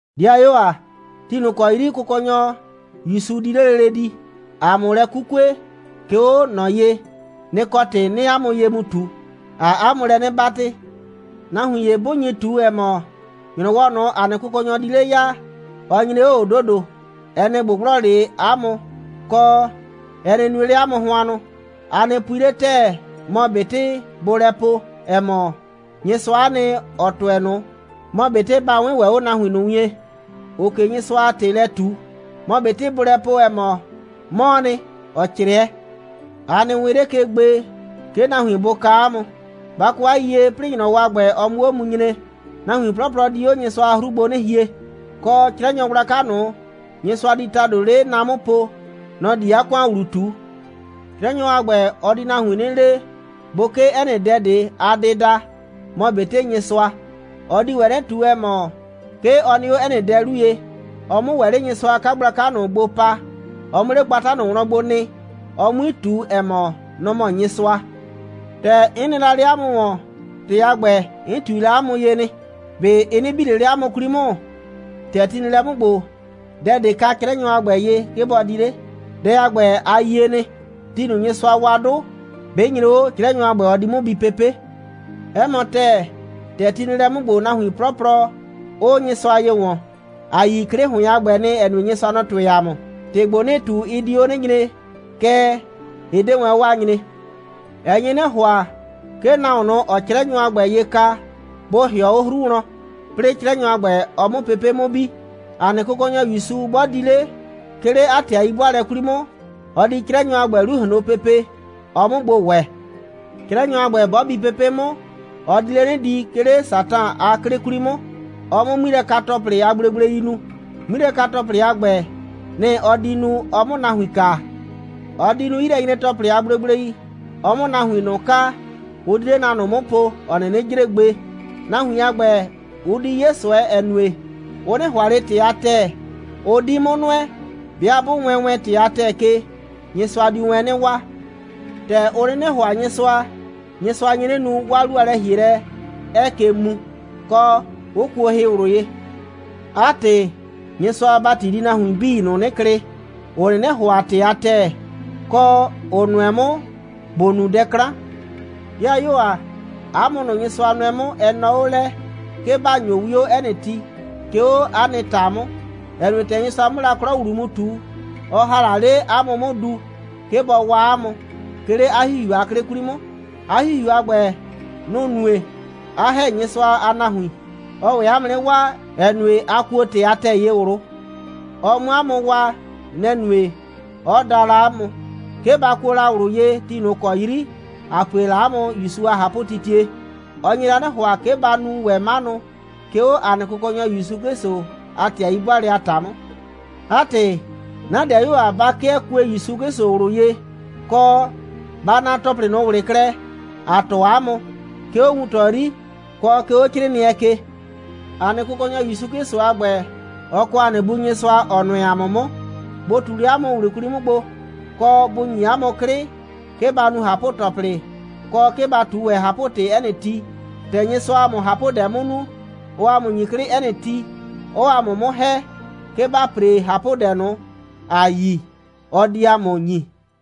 'Dɩayuo ‑a, ti ꞊nʋ ‑kɔ 'yri Kʋkɔnyɔ ‑Yusu di 'le lele di, ‑a 'mʋ lɛ 'kukue, 'ke 'o ꞊nɔ ye, nɩ‑ kɔ ‑tɩ 'nɩɩ 'a mʋ ye mu ꞊tu. ‑Aa 'a mʋ lɛ 'nɩ 'batɩ: Nahuin ‑ye 'bʋ nyi ꞊tu, ‑ɛ mɔ, ‑nyrɔwɔ ꞊nʋ, ‑a nɩ Kʋkɔnyɔ di 'le ya, ɔ nyre 'o ꞊o ‑dodo, ɛ nɩ ꞊gbʋgblɔ 'le 'a mʋ, kɔ, ɛ nɩ nue 'le 'a mʋ hʋannʋ. A nɩ pui 'le ‑tɛɛ, mɔ ꞊betɩ bʋʋ lɛ po, ‑ɛ mɔ, Nyɩsʋa'a nɩ, ‑ɔ tʋɛ ꞊nʋ, mɔ ꞊betɩ ba 'wɩɩn ‑wɛ 'o nahuin ꞊nʋ wien, ‑ʋʋ ꞊ke Nyɩsʋa a ‑tɩ lɛ ꞊tu, mɔ ꞊betɩ bʋʋ lɛ po, ‑ɛ mɔ, 'mɔɔ nɩ, ‑ɔ 'crɩɛ. A nɩ wɩɩn 'le ke gbe, 'ke nahuin bʋ kaa 'a mʋ. Ba kɔ 'a yiyie, 'plɩɩ ‑nyrɔwɔ a ‑gbɛ, ɔ 'mʋ 'o mu nyre, nahuin 'plɔplɔ di 'o Nyɩsʋa a 'hru gbo 'nɩ hie, kɔ, 'Crɛnyɔ gblaka ꞊nʋ, Nyɩsʋa di ‑tado 'le na 'mʋ po, nɔ‑ di 'a ‑kʋan ‑wlu ꞊tu. 'Crɛnyɔ a ‑gbɛ, ɔ di nahuin 'nɩ le, bʋ 'kee 'ɛ nɩ dɛ ꞊de a dɩda, mɔ ꞊betɩ Nyɩsʋa. Ɔ di ‑wɛ 'nɩ ꞊tu, ‑ɛ mɔ, 'ke ɔ nɩ 'o 'ɛ nɩ dɛ ꞊de 'lu ye, ɔ 'mʋ ‑wɛ 'le Nyɩsʋa a 'kagblaka ꞊nʋ gbo pa, ɔ 'mʋ 'le gbata ꞊nʋ wlɔn gbo nɩ, ɔ 'mui ꞊tu, ‑ɛ mɔ, nɔ‑ mɔ Nyɩsʋa. ‑Tɛ 'n nɩ la 'le 'a mʋ ‑wɔn, ‑tɩ a ‑gbɛ, 'n ꞊tui la 'a mʋ ye nɩ. ꞊Be ɩ 'nɩ bi ꞊le 'le 'a mʋ 'kwli 'mʋ? ‑Tɛ ti nɩ lɛ 'mʋ ‑gbo, dɛ ꞊de ka 'Crɛnyɔ a ‑gbɛ ye, 'ke bɔ di 'le. Dɛ a ‑gbɛ, a yie nɩ. Ti ꞊nʋ, Nyɩsʋa wa 'dʋ, 'bɩ nyre 'o, 'Crɛnyɔ a ‑gbɛ, ɔ di 'mʋ bi pepe'. 'Ɛ mɔ ‑tɛɛ, ‑tɛ ti nɩ lɛ 'mʋ ‑gbo, nahuin 'plɔplɔ, 'ʋʋ Nyɩsʋa ye ‑wɔn. ‑A yi 'klɩ ‑hʋɩn a ‑gbɛ nɩ, ‑ɛ nue, Nyɩsʋa, nɔ‑ tʋɩ ‑a mʋ. ‑Tɩ ‑gbo, 'nɩɩ ꞊tu, ɩ di 'o 'nɩ nyre, kɛɛ, ɩ 'de wɛn 'o a nyree. Ɛ nye 'nɩ ‑hʋa, 'ke nahuon ꞊nʋ, ‑ɔɔ 'Crɛnyɔ a ‑gbɛ ye ka, bʋ ‑hɩɔ 'o 'hru wlɔn, 'plɩɩ 'Crɛnyɔ a ‑gbɛ, ɔ 'mʋ pepe' 'mʋ bi. ‑A nɩ Kʋkɔnyɔ ‑Yusu 'bɔ di 'le, 'ke 'le 'a ‑tɩ a 'yi'bʋaalɛ 'kwli 'mʋ, ɔ di 'Crɛnyɔ a ‑gbɛ 'lu ꞊hloon pepe, ɔ 'mʋ gbo ‑wɛ. 'Crɛnyɔ a ‑gbɛ, 'bɔ bi pepe' 'mʋ, ɔ di 'le 'nɩ di, 'ke 'le Satan a 'klɩ 'kwli 'mʋ, ɔ 'mʋ 'ŋmilɛka‑tɔplɩ a gblegblei nu. 'Ŋmilɛka‑tɔplɩ a ‑gbɛ, nɩ‑ ɔ di nu, ɔ 'mʋ nahuin kaa. Ɔ di nu 'yilɛnyre‑tɔplɩ a gblegblei, ɔ 'mʋ nahuin ꞊nʋ kaa, ʋ di 'le na ꞊nʋ 'mʋ po, ‑ɔ 'nɩnɩ jre gbe. Nahuin a ‑gbɛ, ʋ di 'ye ꞊sʋɛ, ‑ɛ nue, ʋ 'nɩ ‑hʋa ꞊le ‑tɩ a ‑tɛɛ, 'ʋ 'di 'mʋ nʋɛ. 'Bɩa 'bʋ wɛɛn wɛn ‑tɩ a ‑tɛɛ ke, Nyɩsʋa diu wɛn 'nɩ waa. ‑Tɛ ʋ 'nɩnɩ ‑hʋa Nyɩsʋa, Nyɩsʋa nye 'nɩ nu, 'waa 'lu a lɛ‑hielɛ 'ɛɛ ke muu, kɔ, 'ʋ kuo hɩ ꞊wlʋ ye. 'A ‑tɩ, Nyɩsʋa a ‑bati di nahuin 'bii ꞊nʋ 'nɩ klɩ, ‑ʋ 'nɩnɩ ‑hʋa ‑tɩ a ‑tɛɛ, kɔ, ‑ʋ nʋɛ 'mʋ ‑bʋ nu dɛ 'klan. 'Dɩayuo ‑a, 'a mʋ ꞊nʋ, Nyɩsʋa nʋɛ 'mʋ, ɛ nɔɔ 'o lɛ, 'ke ‑ba ‑nyo 'wio 'ɛ nɩ ti, 'ke 'o 'a nɩ ‑ta 'mʋ, ‑ɛ nue, ‑tɛ Nyɩsʋa 'mʋ la 'klɔ ‑wlu mu ꞊tu, ɔ ‑ha la 'le 'a mʋ 'mʋ du, 'ke bɔ waa 'a mʋ, 'ke 'le 'a ‑Hihiu a 'klɩ 'kwli 'mʋ. 'A ‑Hihiu a ‑gbɛ, nʋ‑ nue, 'a ‑hɛ Nyɩsʋa a nahuin. Ɔɔ ‑wɛ 'a mʋ 'nɩ waa, ‑ɛ nue, a kuo ‑tɩ a ‑tɛɛ ye ꞊wlʋ. Ɔ 'mʋ 'a mʋ waa, nɛ‑ nue, 'ɔ da la 'a mʋ, 'ke ba kuo la ꞊wlʋ ye ti ꞊nʋ ‑kɔ 'yri ‑a pue la 'a mʋ ‑Yusu a ꞊hapʋtitie. Ɔ nye la 'nɩ ‑hʋa, 'ke ba nu ‑wɛ 'manʋ, 'ke 'o ‑a nɩ Kʋkɔnyɔ ‑Yusu 'Klɩsʋ a ‑tɩ a 'yi'bʋaalɛ a ‑ta 'mʋ. 'A ‑tɩ, 'na 'dɩayuo ‑a, ba 'kɩɛ kue ‑Yusu 'Klɩsʋ ꞊wlʋ ye, kɔ, ba naa ‑tɔplɩ ꞊nʋ ꞊wlɩ klɛ, ‑a tɔɔ 'a mʋ, 'ke 'o wuntɔ 'yri, kɔ 'ke 'o 'crɩɩnɩɛ ke. ‑A nɩ Kʋkɔnyɔ ‑Yusu 'Klɩsʋ a ‑gbɛ, ɔ kɔ ‑a nɩ Bu Nyɩsʋa, ‑ɔ nʋɛ ‑a mʋ 'mʋ, bʋ ꞊tu 'le 'a mʋ ꞊wlʋ 'kwli 'mʋ gbo, kɔ, bʋ ‑nyi 'a mʋ 'klɩ, 'ke ba nu ꞊hapʋ‑tɔplɩ, kɔ, 'ke ba ꞊tu ‑wɛ ꞊hapʋ‑tɩ 'ɛ nɩ ti. ‑Tɛ Nyɩsʋaa ‑a mʋ ꞊hapʋdɛ 'mʋ nu, ɔɔ ‑a mʋ ‑nyi 'klɩ 'ɛ nɩ ti, kɔ, 'ɔɔ ‑a mʋ 'mʋ ‑hɛ, 'ke ‑ba ‑pre ꞊hapʋdɛ ꞊nʋ, ‑a yi, ɔ di ‑a mʋ ‑nyi.